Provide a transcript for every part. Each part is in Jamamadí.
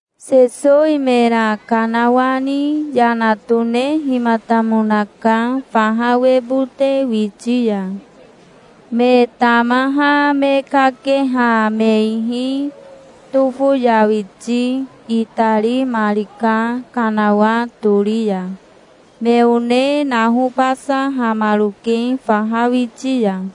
Sesowi mera kanawani yana tonehimatamonaka faha webote witi ya. Me tamaha me kakeha me ihi tofoyawiti itarimarika kanawa tori ya. Me one nahobasahamaroke faha witi ya.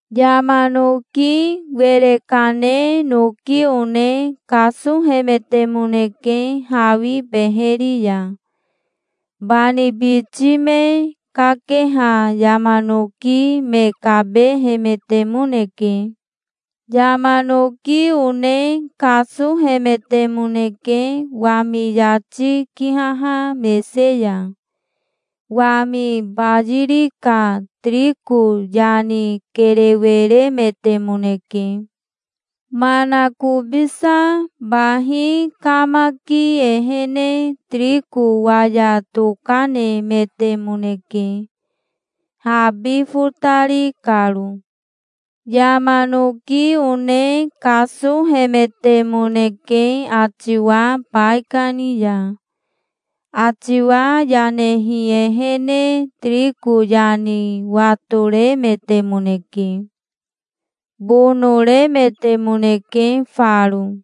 Yama noki were kane noki one kasohemetemoneke hawi beheri ya. Bani biti me kakeha yama noki me kabehemetemoneke. Yama noki one kasohemetemoneke wami yati kihaha mese ya. Wami bayiri ka tiriko yani kerewe remetemoneke. Manakobisa bahi kamaki ehene tiriko waya tokanemetemoneke, habi fotari karo. Yama noki one kasohemetemoneke atiwa baikani ya. Atiwa yanehi ehene tiriko yani watoremetemoneke. Bonoremetemoneke faro.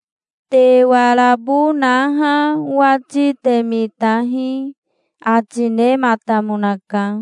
"Te warabo naha owati te mitahi", ati nematamonaka.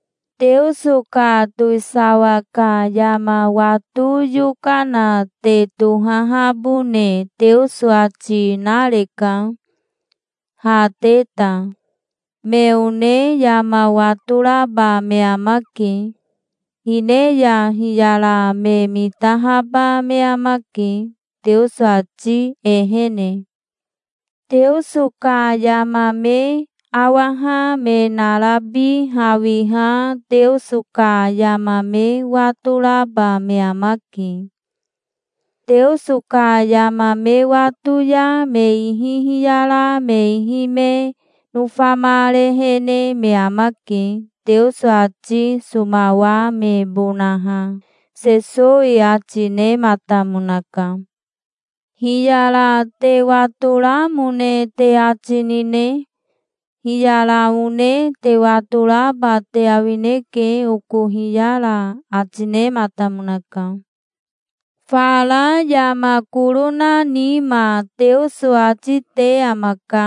"Teoso ka towisawa ka yama wato yokana te tohahabone Teoso ati nareka, ha te ta. Me one yama watoraba me amake. Hine ya hiyara me mitahaba me amake, Teoso ati ehene. Teoso ka yama me awaha me narabi hawiha Teoso ka yama me watoraba me amake. Teoso ka yama me wato ya me ihi hiyara me ihi me nofamarehene me amake, Teoso ati somawamebonaha", Sesowi ati nematamonaka. "Hiyara te watoramone te ati nine? Hiyara one te watoraba te awineke, oko hiyara", ati nematamonaka. "Fara yama koro na nima Teoso ati te amaka.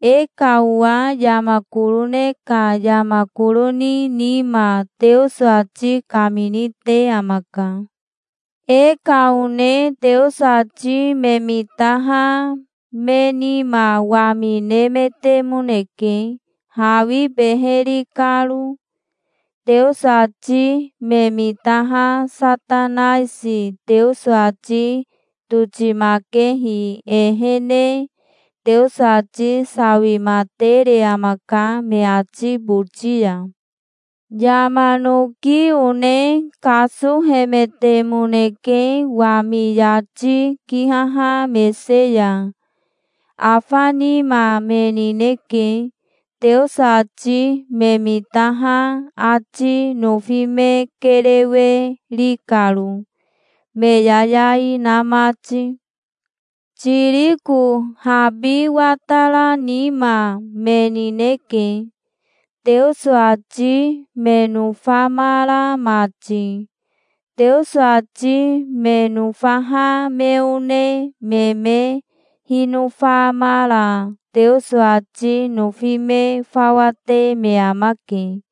E ka owa yama koro ne ka yama koro ni nima Teoso ati kamini te amaka. E ka one Teoso ati me mitaha me nima wami nemetemoneke, hawi beheri karo. Teoso ati me mitaha Satanaisi Teoso ati totimakehi ehene Teoso ati sawimatere amaka me ati boti ya". "Yama noki one kasohemetemoneke wami yati kihaha mese ya. Afa nima me nineke, Teoso ati me mitaha ati nofi me kerewe ri karo, me yayai na mati. Tiriko habi watara nima me nineke, Teoso ati me nofamara mati. Teoso ati me nofaha me one me me hinofamara Teoso ati nofi me fawa te me amake.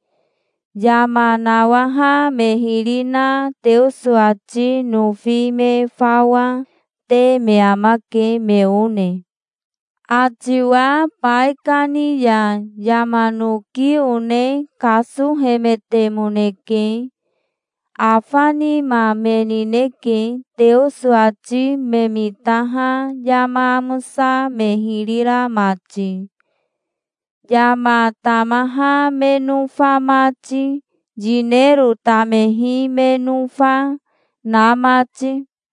Yama nawaha me hiri na Teoso ati nofi me fawa, te me amake, me one". "Atiwa baikani ya yama noki one kasohemetemoneke. Afa nima me nineke, Teoso ati me mitaha yama amosa me hiri ra mati, yama tamaha me nofa mati, yinero tamehi me nofa, na mati".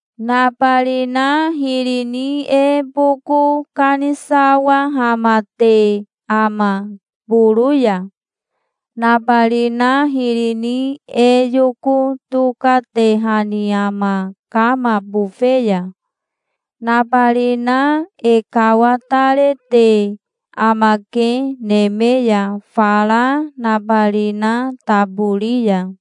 "Nabarina hiri ni e boko kanisawahamate ama, boro ya? Nabarina hiri ni e yoko tokatehani ama kama bofe ya? Nabarina e kawatarete amake neme ya fara nabarina tabori ya.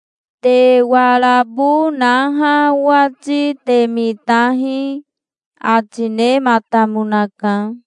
Te warabo naha owati te mitahi", ati nematamonaka.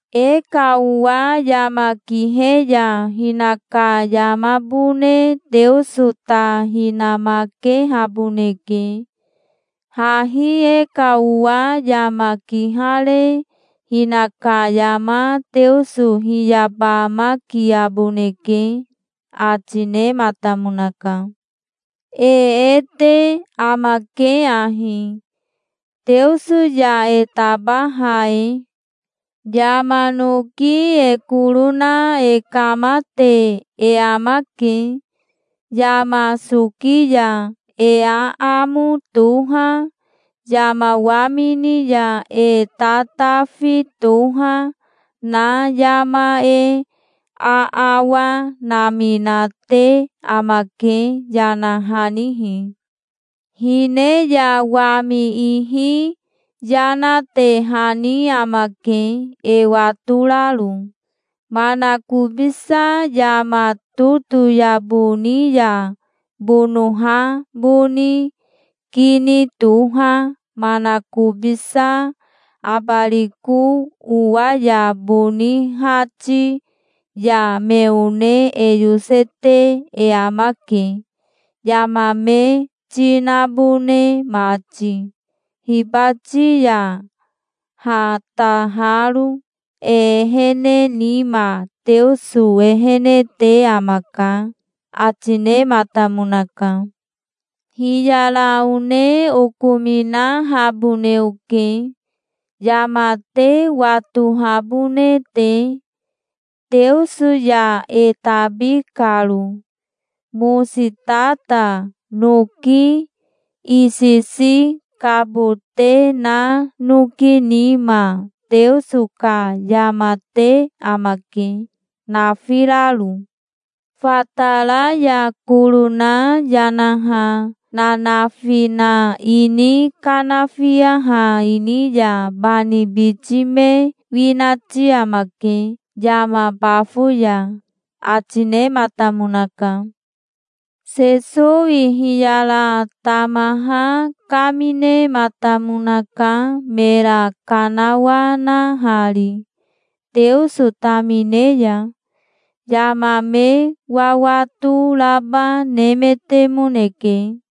E ka owa yama kihe ya hinaka yamabone Teoso ta hinamakehaboneke. Hahi e ka owa yama kihare hinaka yama Teoso hiyabamakiaboneke", ati nematamonaka. "E e te amake ahi, Teoso ya e tabaha e: Yama noki e koro na e kamate e amake. Yama soki ya e aamo toha, yama wamini ya e tatafi toha, na yama e aawa naminate amake, yanahanihi. Hine ya wami ihi yanatehani amake, e watoraro. Manakobisa yama totoyabo ni ya bonoha boni kini toha manakobisa abariko owa ya boni hati ya me one e yosete e amake, yama me ti nabone mati, hibati ya hataharo. E ehene nima Teoso ehene te amaka", ati nematamonaka. "Hiyara one okominahabone oke, yama te watohabone te, Teoso ya e tabi karo. Mositata noki isisi kabote na noki nima Teoso ka yama te amake, nafiraro. Fatara ya koro na yanaha nanafi na ini kanafiaha ini ya bani biti me winati amake yama bafo ya", ati nematamonaka. Sesowi hiyara tamaha kaminematamonaka mera kanawanahari Teoso tamine ya. Yama me wawato raba nemetemoneke.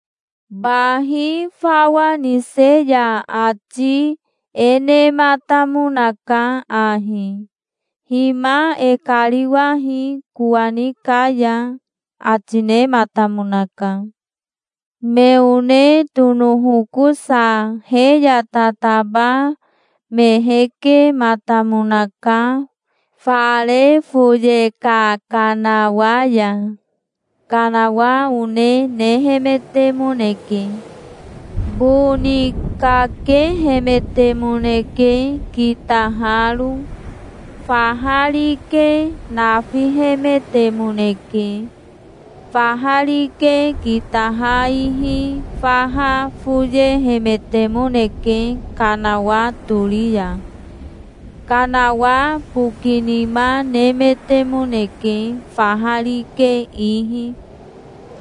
Bahi fawa nise ya ati e nematamonaka ahi: "Hima e kariwahi kowani ka ya", ati nematamonaka. Me one tonohokosa he ya tataba me hekematamonaka, fara foye ka kanawa ya. Kanawa one nehemetemoneke. Boni kakehemetemoneke kitaharo. Faha rike nafihemetemoneke. Faha rike kitaha ihi faha foyehemetemoneke kanawa tori ya. Kanawa bokinima nemetemoneke faha rike ihi.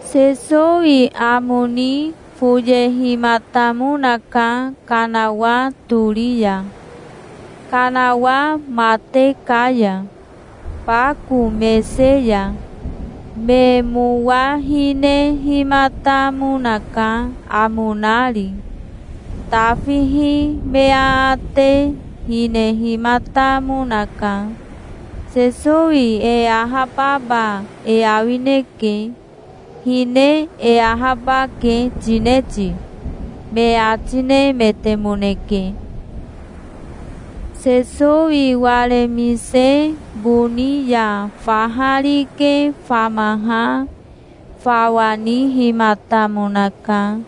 Sesowi amo ni foyehimatamonaka kanawa tori ya, kanawa mate ka ya, bako mese ya. Me mowa hinehimatamonaka amo nari. Tafihi me aate hinehimatamonaka. "Sesowi e ahababa e awineke. Hine e ahabake tine ti?" me ati nemetemoneke. Sesowi waremise boni ya faha rike famaha fawa nihimatamonaka.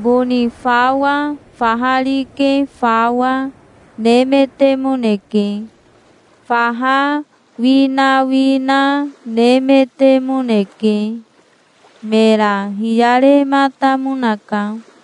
Boni fawa, faha rike fawa, nemetemoneke. Faha winawina nemetemoneke. Mera hiyarematamonaka.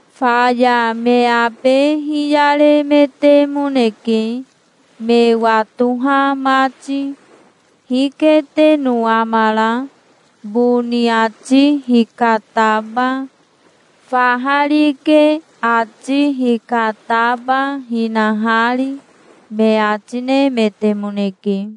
Faya me abe hiyaremetemoneke, me watoha mati. "Hiketeno amara, boni ati hikataba, faha rike ati hikataba, hinahari?" me ati nemetemoneke.